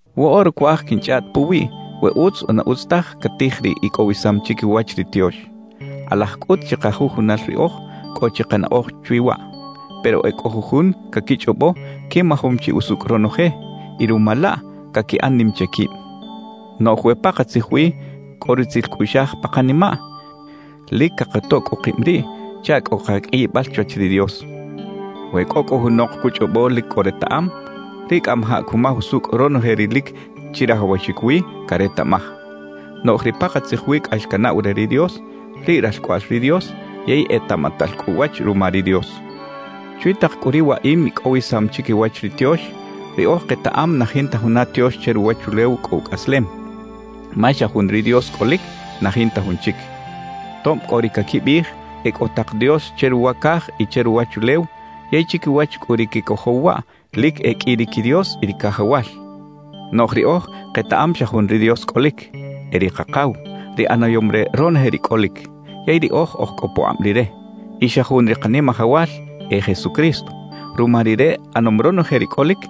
Woꞌora cuaj quinchꞌaꞌt puwiꞌ we utz o na utz taj catij ri icꞌowisam chiquiwach ri tiox. Kꞌalaj cꞌut chikajujunal riꞌoj cꞌo chi kanaꞌoj chwi waꞌ. Pero e cꞌo jujun caquichꞌobo quimajom chi usucꞌ ronoje; y ruma laꞌ, caquiꞌan nim che quib. Noꞌj we pakatzij wi cꞌo rutzil cꞌuꞌxaj pa kanimaꞌ, lic cakatoꞌ cꞌu kib riꞌ chaꞌ cꞌo kaqꞌuiyibal chwach ri Dios. We cꞌo cꞌu junok cuchꞌobo lic cꞌo retaꞌam, riꞌ cꞌamajaꞌ cumaj usucꞌ ronoje ri lic chirajawaxic wi caretaꞌmaj. Noꞌj ri pakatzij wi cꞌax canaꞌw re ri Dios, riꞌ ralcꞌoꞌal ri Dios yey etaꞌmatal cꞌu uwach ruma ri Dios. Chwi tak cꞌu ri waꞌim icꞌowisam chiquiwach ri tiox, riꞌoj ketaꞌam na jinta juna tiox che ruwachulew cꞌo ucꞌaslem, ma xa jun ri Dios cꞌolic, na jinta jun chic. Tob cꞌo ri caquibiꞌij e cꞌo tak dios che ruwa caj y che ruwachulew; yey chiquiwach cꞌu ri quecojow waꞌ, lic e qꞌui ri quidios y ri cajawal; noꞌj riꞌoj ketaꞌam xa jun ri Dios cꞌolic, e ri Kakaw, ri ꞌanayom re ronoje ri cꞌolic. Yey riꞌoj oj cꞌo pukꞌab Rire. Y xa jun ri Kanimajawal, e Jesucristo. Ruma Rire ꞌanom ronoje ri cꞌolic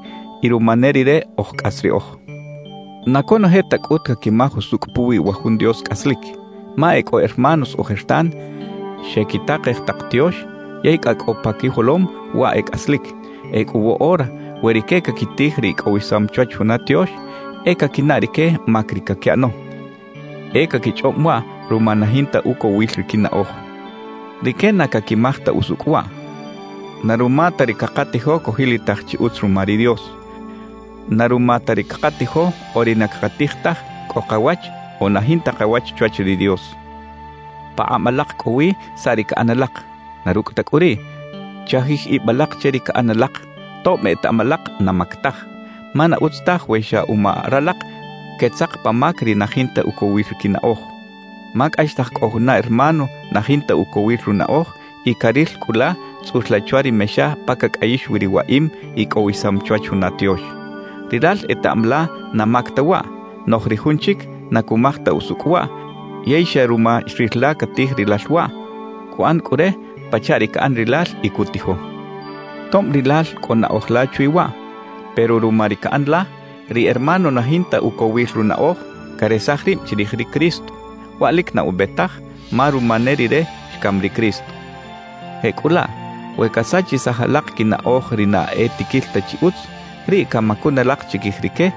y ruma ne Rire oj cꞌas riꞌoj. Na conoje ta cꞌut caquimaj usucꞌ puwi wa jun Dios cꞌaslic; ma e cꞌo hermanos ojertan xequitakej tak tiox, yey cꞌa cꞌo pa quijolom waꞌ e cꞌaslic. Ecꞌu woꞌora we rique caquitij ri icꞌowisam chwach juna tiox, e caquinaꞌ rique mac ri caquiꞌano. E caquichꞌob waꞌ ruma na jinta ucowil ri quinaꞌoj. Rique na caquimaj ta usucꞌ waꞌ: Na ruma ta ri cakatijo cojilitaj chi utz ruma ri Dios. Na ruma ta ri cakatijo o ri na cakatij taj cꞌo kawach o na jinta kawach chwach ri Dios. Pakꞌab alak cꞌo wi saꞌ ri caꞌan alak. Na rucꞌ ta cꞌu riꞌ, chajij ib alak che ri caꞌan alak, tob etaꞌam alak na mac taj. Ma na utz taj we xa uma ralak quetzak pa mac ri na jinta ucowil ri quinaꞌoj. Ma cꞌaxtaj cꞌo juna hermano na jinta ucowil runaꞌoj y caril cꞌu la tzꞌul la chwa ri mexa pa cacꞌayix wi ri waꞌim icꞌowisam chwach juna tiox. Rilal etaꞌam la na mac ta waꞌ, noꞌj ri jun chic na cumaj ta usucꞌ waꞌ yey xa ruma xril la catij rilal waꞌ, cuꞌan cꞌu re pachaꞌ ri caꞌan rilal y cutijo. Tob rilal cꞌo naꞌoj la chwi waꞌ, pero ruma ri caꞌan la, ri hermano na jinta ucowil runaꞌoj, caresaj rib chirij ri Cristo. ¡Waꞌ lic na ube taj, ma ruma ne rire xcam ri Cristo! Jecꞌulaꞌ we casachisaj alak quinaꞌoj ri na e tiquil ta chi utz, riꞌ camacun alak chiquij rique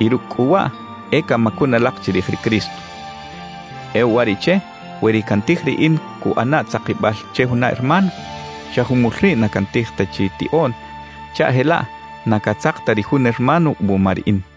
y rucꞌ cꞌu waꞌ, e camacun alak chirij ri Cristo. E uwariꞌche we ri cantij riꞌin cuꞌana tzakibal che juna hermano, xa jumul riꞌ na cantij ta chi tiꞌoꞌn chaꞌ jelaꞌ na catzak ta ri jun hermano wuma riꞌin.